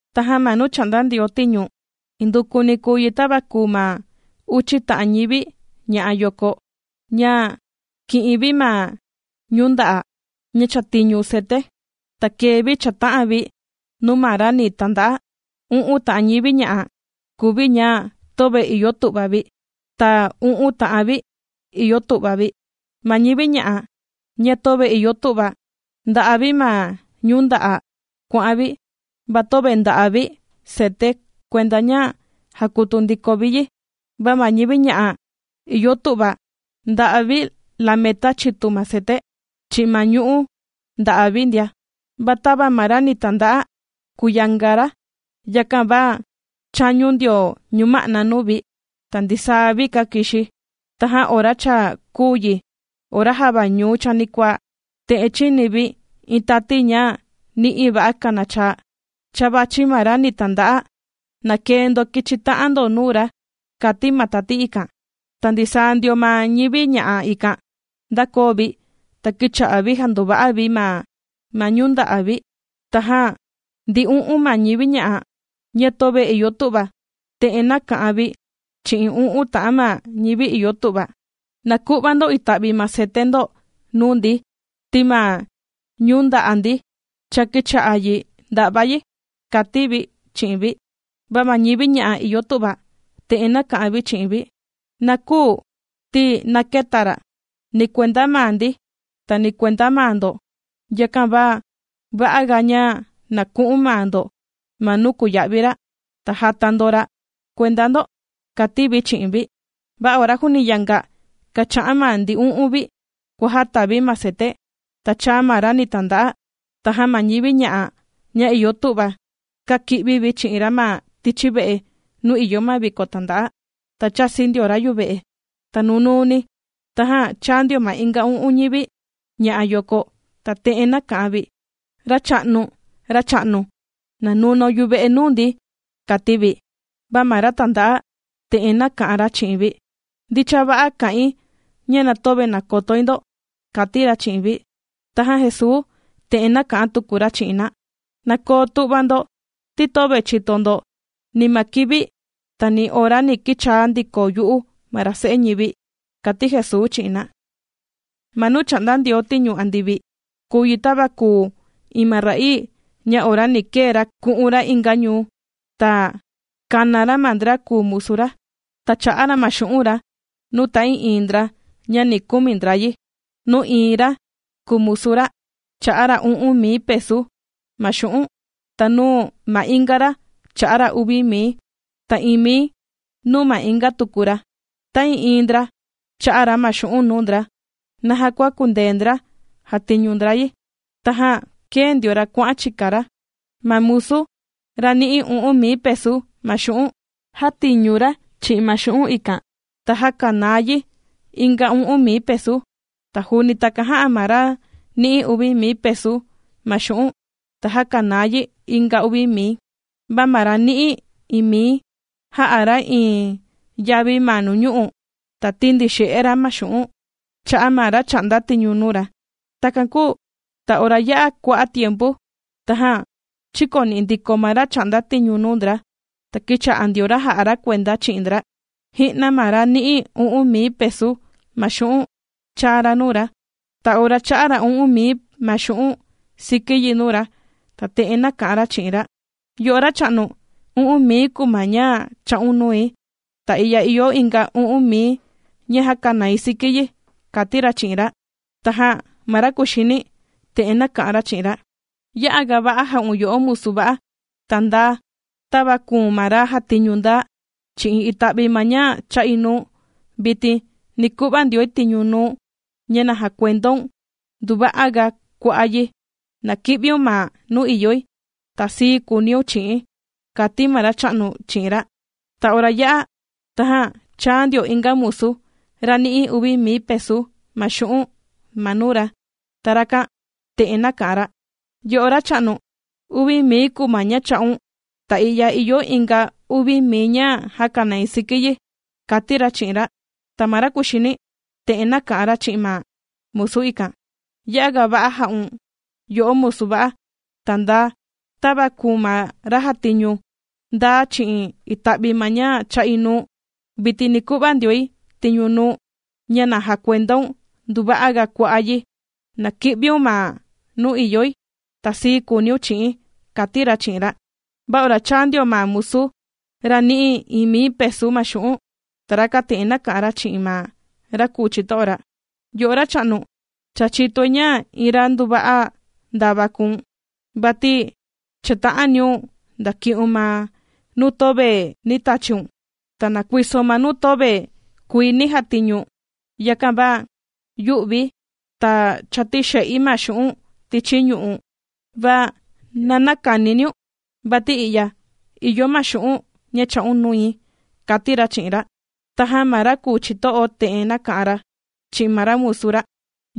’Tajan ma nuu chà'nda Ndioo tiñu, indukuni kùu yi tava kùu ma uchi ta'an ñivi ña'a yoko, ña kī'in vi ma ñu'ú nda'a, ña chàtiñu cete, ta kēe vi chāta'an vi nuu ma ra ni tanda'a. U'un ta'an ñivi ña'a kùu vi ña töve ìyo tu'va vi, ta u'un ta'an vi ìyo tu'va vi. Ma ñivi ña'a, ña töve ìyo tu'va, ndà'a vi ma ñu'ú nda'a' kuà'an vi, va töve ndà'a vi cete kuenda ña jàkutu ndiko vi yi. Va ma ñivi ña'a ìyo tu'va, ndà'a vi lometa chitu ma cete, chi'in ma ñu'ú nda'a' vi ndia. Va tava ma ra ni tanda'a kùyanga ra, yakan va chāñu ndio ñuma'na nuu vi, ta ndisaa vi kākixi. Tajan ora cha kùu yi ora java ñuu chanikuaa, te'en chīni vi iin tati ña ni'i va'a kanachaa: “¡Cha vàchi ma ra ni tanda'a, na kee ndo kichi ta'an ndo nuu ra!”, kàti ma tati ikan. Ta ndisaa ndio ma ñivi ña'a ikan ndākoo vi, ta kīcha'a vi jàndova'a vi ma ñu'ú nda'a' vi. Tajan ndi u'un ma ñivi ña'a, ña töve ìyo tu'va, te'en nāka'an vi chi'in u'un ta'an ma ñivi ìyo tu'va: “Na ku'va ndo ita'vi ma cete ndo nuu ndi, ti ma ñu'ú nda'a' ndi cha kīcha'a yi ndà'va yi”, kàti vi chi'in vi. Va ma ñivi ña'a ìyo tu'va, te'en nāka'an vi chi'in vi: “Na küu, ti na këta ra', ni kuenda maa ndi, ta ni kuenda maa ndo. Yakan va va'a ga, ña na ku'un maa ndo ma nuu kùya'vi ra', ta jàta ndo ra' kuenda ndo”, kàti vi chi'in vi. Va ora juuni yanga kàcha'an ma ndi u'un vi kuàjata vi ma cete, ta chāa ma ra ni tanda'a. Tajan ma ñivi ña'a, ña ìyo tu'va, kāki'vi vi chi'in ra ma tichi ve'e nuu ìyo ma viko tanda'a, ta chāsi ndio ra yuve'e. Ta nunuuni, tajan chāa ndio ma inga u'un ñivi ña'a yoko, ta te'en nāka'an vi: “¡Racha'nu, Racha'nu, na nunaun yuve'e nuu ndi!”, kàti vi. Va ma ra tànda'a, te'en nāka'an ra chi'in vi: “Ndicha va'a kà'in, ña na töve nàkotoi ndo”, kàti ra chi'in vi. Tajan Jesuu te'en nāka'an tuku ra chi'in na: ―Na koo tu'va ndo, ti töve chìto ndo, ni ma kivi, ta ni ora ni kichaa ndiko yu'u ma ra Se'e ñivi. Jesuu kà'an ra iin ku'va cha'a' xu'un' ’Ma nuu chà'nda Ndioo tiñu andivi, kùu yi tava kùu iin ma ra'ii ña ora ni kee ra ku'un ra inga ñuu, ta kāna ra ma ndra kùu musu ra, ta chā'a ra ma xu'un' ra nuu ta'ii'iin ndra ña na kumi ndra yi. ’Nuu iin ma ra kùu musu ra, chā'a ra u'un mii pesu ma xu'un', ta nuu ma inga ra chā'a ra uvi mii, ta iin mii nuu ma inga tuku ra. Ta'ii'iin ndra, chā'a ra ma xu'un' nuu ndra, naja kua kùndee ndra jàtiñu ndra yi. Tajan kēe ndio ra kuà'an chika ra. Ma musu, ra nī'i u'un mii pesu ma xu'un', jātiñu ra chi'in ma xu'un' ikan, ta jākanaa yi inga u'un mii pesu. Ta juuni takan jā'a, ma ra nī'i uvi mii pesu ma xu'un', ta jākanaa yi inga uvi mii. Va ma ra nī'i iin mii, jā'a ra iin yavi ma nuñu'u', ta tīndixe'e ra ma xu'un' chā'a ma ra chà'nda tiñu nuu ra. ’Takan kūu ta ora yā'a kua'a' tiempu, tajan chīkoni'i ndiko ma ra chà'nda tiñu nuu ndra, ta kīcha'a ndio ra jà'a ra kuenda chi'in ndra. Ji'na ma ra nī'i u'un mii pesu ma xu'un' chāa ra nuu ra. Ta ora chā'a ra u'un mii ma xu'un' siki yi nuu ra, ta te'en nāka'an ra chi'in ra: “Yo'o Racha'nu, u'un mii kùu ma ña chā'un nui, ta i'ya ìyo inga u'un mii ña jākanai siki yi”, kàti ra chi'in ra. Tajan ma ra kuxini, te'en nāka'an ra chi'in ra: “Ya'a ga va'a jā'un yo'o musu va'a, ta ndaa. Tava kùu̱n ma ra jātiñu ndaa chi'in ita'vi ma ña chā'i nuu̱n, vitin ni ku'va ndioi tiñu nuu̱n, ña na jakuendaun nduva'a ga kua'a' yi. Na ki'viun ma nuu ìyoi, ta sii kuuniun chi'i̱n”, kàti ma racha'nu chi'in ra. Ta ora yā'a, tajan chāa ndio inga musu, ra nī'i uvi mii pesu ma xu'un' ma nuu ra, ta rakan te'en nāka'an ra: “Yo'o Racha'nu, uvi mii kùu ma ña chā'un, ta i'ya ìyo inga uvi mii ña jākanai siki yi”, kàti ra chi'in ra. Ta ma ra kuxini, te'en nāka'an ra chi'in ma musu ikan: “Ya'a ga va'a jā'un yo'o musu va'a, ta ndaa. Tava kùu̱n ma ra jātiñu ndaa chi'in ita'vi ma ña chā'i nuu̱n, vitin ni ku'va ndioi tiñu nuu̱n, ña na jakuendaun nduva'a ga kua'a' yi. Na ki'viun ma nuu ìyoi, ta sii kuuniun chi'i̱n”, kàti ra chi'in ra. Va ora chāa ndio ma musu, ra nī'i iin mii pesu ma xu'un'. Ta rakan te'en nāka'an ra chi'in ma ra kùu chito'o ra: “Yo'o Racha'nu, cha chìtoi ña iin ra nduva'a ndava kùu̱n, vati chàta'aniun ndaki'un ma nuu töve nī tachiun, ta nàkuisoun ma nuu töve kuii nī jatiñu. Yakan va yū'vi̱, ta chātixe'i ma xu'un' tichi ñu'u'. Va na näkaniniun, vati i'ya ìyo ma xu'un' ña chā'un nui”, kàti ra chi'in ra. Tajan ma ra kùu chito'o, te'en nāka'an ra chi'in ma musu ra: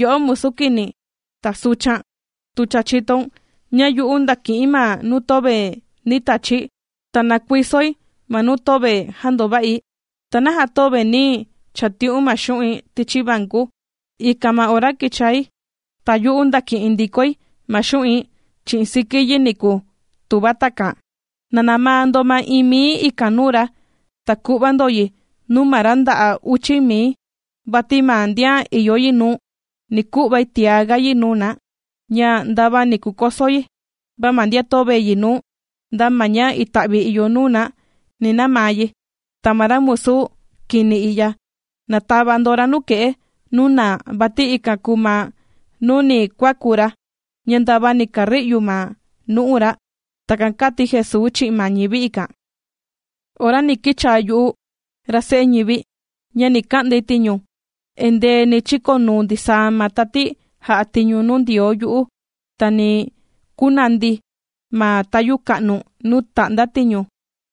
“Yo'o musu kini, ta suchan, tu cha chìtoun ña yu'u ndàki'i̱n ma nuu töve nī tachi̱, ta nàkuisoi ma nuu töve jāndova'i, ¿ta naja töve nī chati'un ma xu'in tichi vanku, ikan ma ora kichai, ta yu'u ndaki'in ndikoi ma xu'in chi'in siki yi niku, tuva takan?” ’“Na namaa ndo ma iin mii ikan nuu ra, ta ku'va ndo yi nuu ma ra nda'a uchi mii. Vati ma ndian ìyo yi nuu, ni ku'vai tiá ga yi nuu na, ña ndava ni kukoso yi. Va ma ndian töve yi nuu, nda ma ña ita'vi ìyo nuu na, ni namaa yi. Ta ma ra musu kini i'ya, na tava ndo ra nuke'e, nuu naa, vati ikan kùu ma nuu ni kuaku ra, ña ndava ni kari'u ma nu'u ra.” ―Takan kàti Jesuu chi'in ma ñivi ikan. ’Ora ni kichaa yu'u, ra Se'e ñivi, ña ni ka'ndai tiñu, endee ni chikonuu ndisaa ma tati jà'a tiñu nuu Ndioo yu'u, ta ni kunandi̱ ma tayu ka'nu nuu tà'nda tiñu,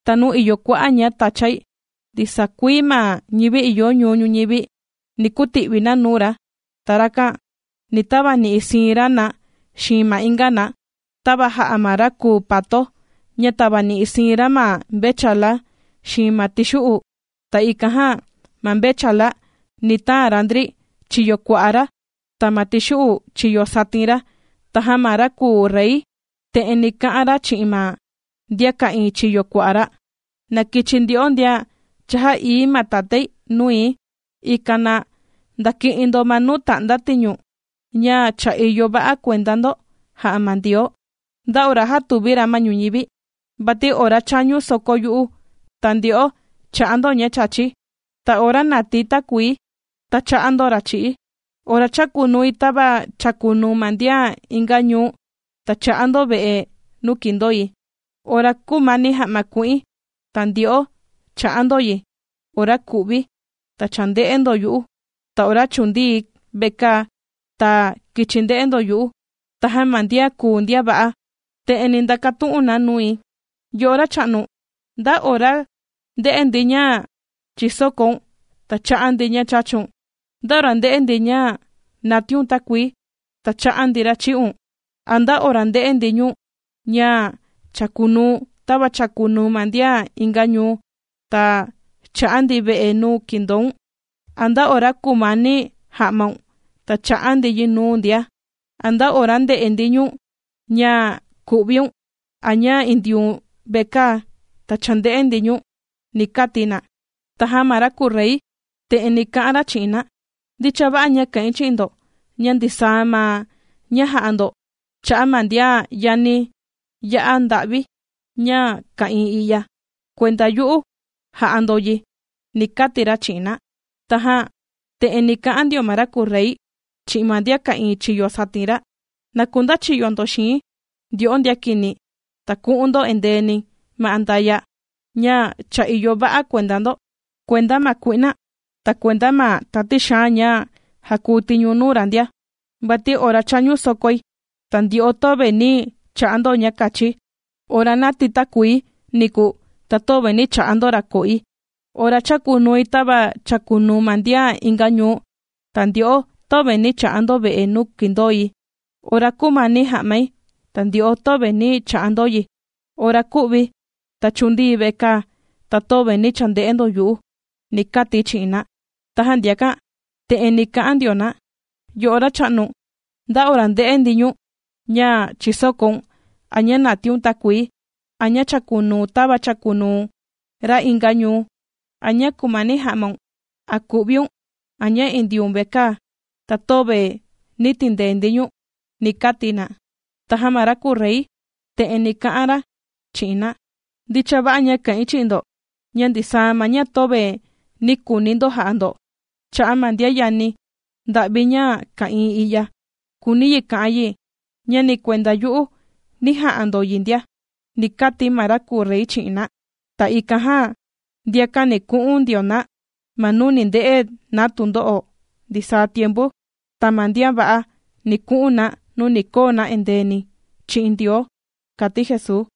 ta nuu ìyo kua'a' ña tachai. Ndisaa kuii ma ñivi ìyo ñuu ñuñivi, ni kuti'vi na nuu ra, ta rakan ni tavani'i siin ra na xiin ma inga na, tava jà'a ma ra kùu pato, ña tavani'i siin ra ma mvechala xiin ma tixu'u. Ta ikan jan ma mvechala, ni taan ra ndri chiyo kua'a ra, ta ma ma tixu'u chiyo satin ra. Tajan ma ra kùu Rey, te'en ni ka'an ra chi'in ma ndian ka'ìin chiyo kua'a ra: “Na kichi ndyo'o ndian cha jā'ií ma Tatái nui, ikan na ndaki'in ndo ma nuu ta'nda tiñu, ña cha ìyo va'a kuenda ndo jā'a ma Ndioo, nda ora jātuvi ra ma ñuñivi. Vati ora chāñu soko yu'u, ta ndyo'o chā'a ndo ña chāchi, ta ora nātii takuii, ta chā'a ndo ra' chī'i̱, ora chākunui tava chàkunuu ma ndian inga ñuu, ta chā'a ndo ve'e nuu kīndoi. Ora kūmani ja'ma ku'in, ta ndyo'o chā'a ndo yi, ora kū'vi̱, ta chānde'e ndo yu'u, ta ora chūndii̱ vekaa, ta kīchi nde'e ndo yu'u.” Tajan ma ndian kùu ndian va'a, te'en ni ndakatu'un na nui: “Yo'o Racha'nu, ¿nda ora ndē'e ndi ña chīsokoun, ta chā'a ndi ña chāchun? ¿Nda ora ndē'e ndi ña nātíiun takuii, ta chā'a ndi ra' chī'un? ¿A nda ora ndē'e ndi ñu̱n ña chākunuu̱n tava chàkunuu ma ndian inga ñuu, ta chā'a ndi ve'e nuu kīndoun? ¿A nda ora kūmani ja'maun, ta chā'a ndi yi nuu̱n ndia? ¿A nda ora ndē'e ndi ñu̱n ña ku'viun, a ña indiun vekaa, ta chānde'e ndi ñu̱n?”, ni kati na. Tajan ma ra kùu Rey, te'en ni ka'an ra chi'in na: “Ndicha va'a ña kà'in chi'in ndo, ña ndisaa ma ña jā'a ndo cha'a' ma ndian yani ya'a nda'vi ña ka'ìin i'ya, kuenda yu'u jā'a ndo yi”, ni kati ra chi'in na. ’Tajan te'en ni ka'an ndio ma ra kùu Rey, chi'in ma ndian ka'ìin chiyo satin ra: “Na kundachiyo ndo xii̱n, ndyo'o ndian kini, ta ku'un ndo indeeni ma andaya', ña cha ìyo va'a kuenda ndo, kuenda ma kui'na, ta kuenda ma tati xaan ña jàkuu tiñu nuu ra ndia. Vati ora chāñu sokoi, ta ndyo'o, töve nī cha'a ndo ña kachi, ora nātii takuii niku, ta töve nī cha'a ndo ra' ko'i. Ora chākunui tava chàkunuu ma ndian inga ñuu, ta ndyo'o, töve nī cha'a ndo ve'e nuu kìndoi. Ora kūmani ja'mai, ta ndyo'o, töve nī cha'a ndo yi, ora kū'vi̱, ta chūndii̱ vekaa, ta töve nī chande'e ndo yu'u”, ni kati̱ chi'in na. Tajan ndiakan, te'en ni ka'an ndio na: “Yo'o Racha'nu, ¿nda ora ndē'e ndi ñu̱n, ña chìsokoun, a ña nàtiun takuii, a ña chàkunuu̱n tava chàkunuu ra inga ñuu, a ña kùmani ja'maun, a kù'viun, a ña indiun vekaa, ta töve nī tindee ndi ñu̱n?”, ni kati na. Tajan ma ra kùu Rey, te'en ni ka'an ra chi'in na: “Ndicha va'a ña kà'in chi'in ndo, ña ndisaa ma ña töve nī kuuni ndo ja'a ndo, cha'a' ma ndian yani nda'vi ña ka'ìin i'ya, kùuni yi ka'an yi, ña ni kuenda yu'u nī ja'a ndo yi ndia”, ni kati ma ra kùu Rey chi'in na. Ta ikan jan ndiakan ni ku'un ndio na ma nuu ni nde'e na tundo'o ndisaa tiempu, ta ma ndian va'a, ni ku'un na, nuu ni koo na indeeni chi'in Ndioo ―kàti Jesuu.